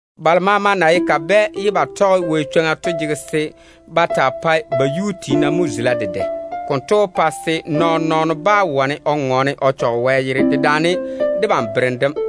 Balo maama na ye kabɛ ye ba tɔge Wɛ chwoŋa to jege se ba taa pae ba yuu tiina mo zula dedɛ. Konto wó che se nɔɔn-nɔɔno yé na chwoŋa se o ŋɔɔne o yaale Wɛ yere dem dedaane debam berem dem.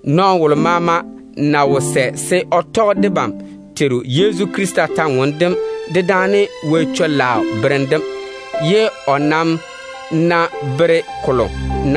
Nɔɔno wolo maama ná wo sɛ se o tɔge debam Teiru Yezu Krista bera yam, dedaane Wɛ chwoŋa berem chekke dem, ye o nam ná bere wo-gaa,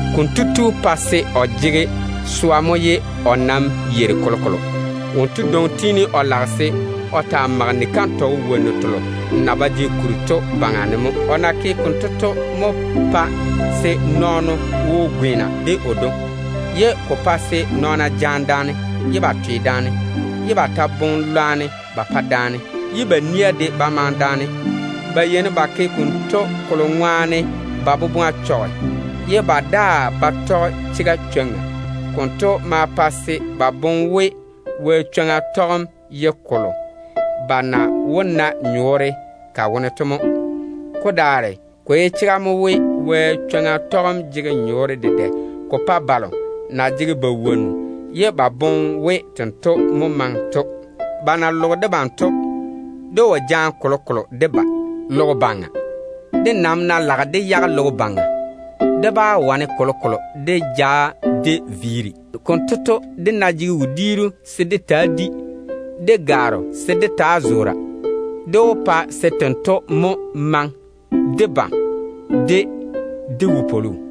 konto tu pae se o jege swa mo ye o nam yeiri kolokolo. Wonto dwoŋi tiini o lage se o taa mage ni-kantɔgɔ wonnu telo na ba jege kuri to baŋa ne mo. O na ke konto to mo pae se nɔɔno wo gweena de o dwoŋi. Ko ta maa pae se nɔɔna jaane daane, ye ba twe daane, ye ba ta boŋe lwarem ba pa daane, ye ba nia de ba maŋe daane. Ba yeini ba ke konto ba boboŋa na chɔge ye ba daa ba tɔge chega chwoŋa to ŋwaane. Konto maa pae se ba boŋe we, Wɛ chwoŋa tɔgem ye kolo ba na wó tɔge ko baŋa ne ba na nyɔɔre ba pa ba tete to mo. Ko daare ko ye chega mo we, Wɛ chwoŋa tɔgem jege nyɔɔre dedɛ ko pae balo na jege ba wonnu ye ba boŋe we tento mo maŋe to. Ba na loge debam to, dé wo jaane kolokolo dé ba logo baŋa. Dé nam ná lage dé yage logo baŋa, dé bá wane kolokolo dé ja dé viiri. Konto to, dé ná jege wodiiru se dé taa di, de gwaaro se dé taa zoora, dé wó pa se tento mo maŋe debam de dé wopwolo.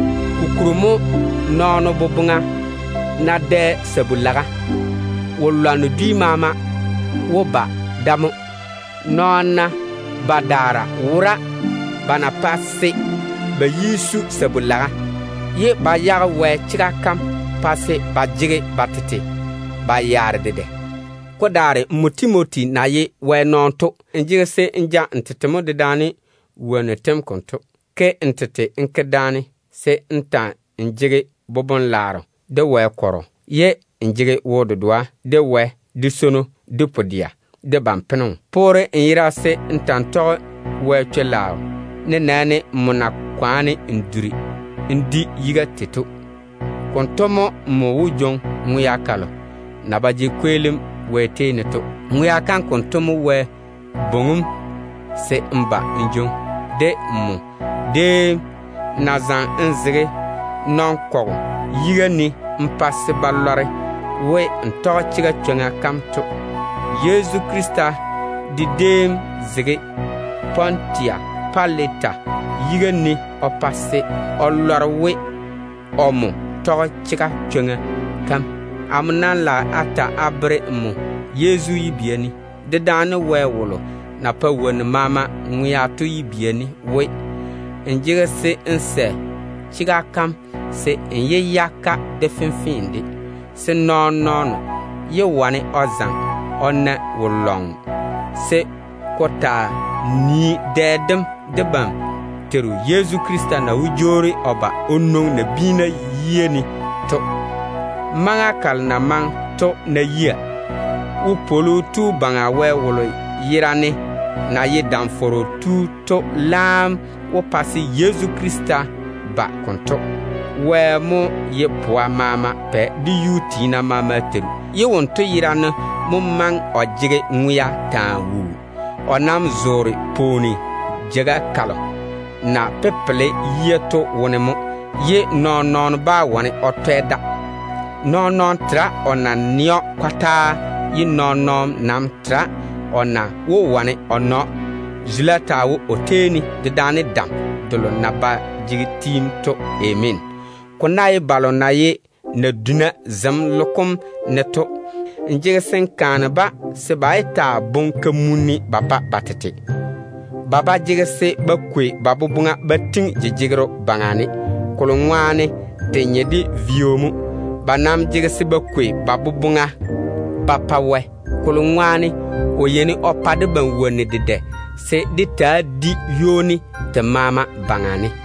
Kokuri to, nɔɔno boboŋa ná dɛ sabu-laga, wo-lwanno dwi maama wó ba da mo. Nɔɔna badaara wora ba na pɛ se ba yi zo sabu-laga, ye ba ywori Wɛ chwoŋa kam wone pa se ba jege ba tete ba yaare dedɛ. Ko daare nmo Timoti na ye Wɛ tontoŋeno to, n jege se n ja n tete mo dedaane wonnu tem konto. Ke n tete n ke daane se n ta‑n jege boboŋ-dɛɛra, de Wɛ kɔrɔ, ye n jege wo-dedoa de Wɛ, de swono, de pu-dɛa, de ban-peno. Poore n yera se n ta‑n tɔge Wɛ chwo-laao, nenɛɛne n na kwaane n zo jaŋa wone se n di yiga tei to. Konto mo nmo wó jwoŋi ŋwea kalo na ba jege kweelim Wɛ tei ne to. Ŋwea kam konto mo Wɛ bwoŋi‑m se n ba n jwoŋi, de nmo déem na zaŋe n zege nɔn-kɔgɔ yiga ne n pa se ba lɔre we, n tɔge chega chwoŋa kam to. Yezu Krista de déem zege Pontusi Pilata yiga ne o pa se o lɔre we, omo tɔge chega chwoŋa kam. Amo nam lage a ta a bere nmo Yezu yibia ne, dedaane Wɛ wolo na pae wonnu maama ŋwea to yibia ne we, n jege se n yɔɔre n ta‑n tɔge chega kam konto, se nɔɔn-nɔɔno yé wane o zaŋe o na nmo wo-lɔŋɔ, se ko taa nii dɛ dem debam Teiru Yezu Krista na wó jwoori o ba o veere o tete nabiina yiga ne to. Maŋa kalo na maŋe to ná yia, Lam-fɔrɔ Tu Baŋa Wɛ wolo yerane na tei nɔɔna maama to laam wó pa se Yezu Krista jwoori o ba konto. Wɛ mo ye pwa maama Pɛ de dedɛɛra maama Teiru, ye wonto yerane mo maŋe o jege ŋwea taa wuu. O nam zoore pwooni jeiga kalo na pepele yia to wone mo, ye nɔɔn-nɔɔno bá wane o twɛ da. Nɔɔn-nɔɔno tera o na nɛ o yibia yam kɔtaa, ye nɔɔn-nɔɔno nam tera o yia na wó wane ya na‑o. Zula taa wo o tei ne, dedaane dam delo na ba jege tiim to. Ameena. Ko ná ye balo na ye naduna zem logo kom ne to, n jege se n kaane-ba se ba yé boŋe kamunim ba pa ba tete. Ba ba jege se ba kwei ba teena ba daŋe jejegero baŋa ne, kolo ŋwaane te nye de vio mo. Ba nam jege se ba kwei ba teena ba pa Wɛ, kolo ŋwaane o yeini o pa debam wonnu dedɛ se dé taa di ywoni te maama baŋa ne.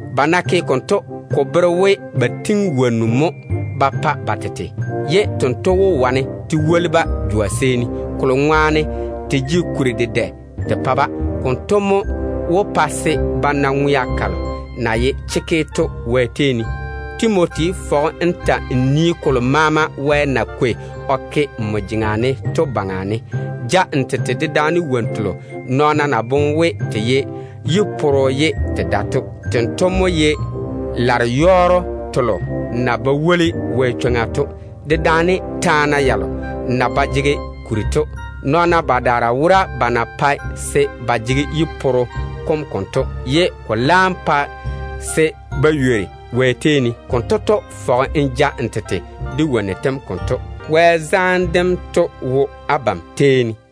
Ba ná ke konto, ko wó bere we ba tiŋi wonnu mo ba pa ba tete, ye tento wó wane te woli-ba jwa seeni, te na jege kuri dedɛ te pa-ba to ŋwaane. Konto mo wó pa se ba na ŋwea kalo na ye chekke to Wɛ tei ne. Timoti, fɔge n ta‑n nii kolo maama Wɛ na kwei o ke nmo jeŋa ne to baŋa ne. Ja n tete dedaane wonnu telo nɔɔna na boŋe we te pae yi-poro ye te ba pae to. Tento mo ye lare-yɔɔro telo na ba woli Wɛ chwoŋa to, dedaane taana yalo na ba jege kuri to. Nɔɔna badaara wora ba na pae se ba jege yi-poro kom konto, ye ko laam pa se ba ywori Wɛ chwoŋa kam wone. Konto to, fɔge n ja n tete de wonnu tem konto. Wɛ zaane dem taa wo abam tei ne.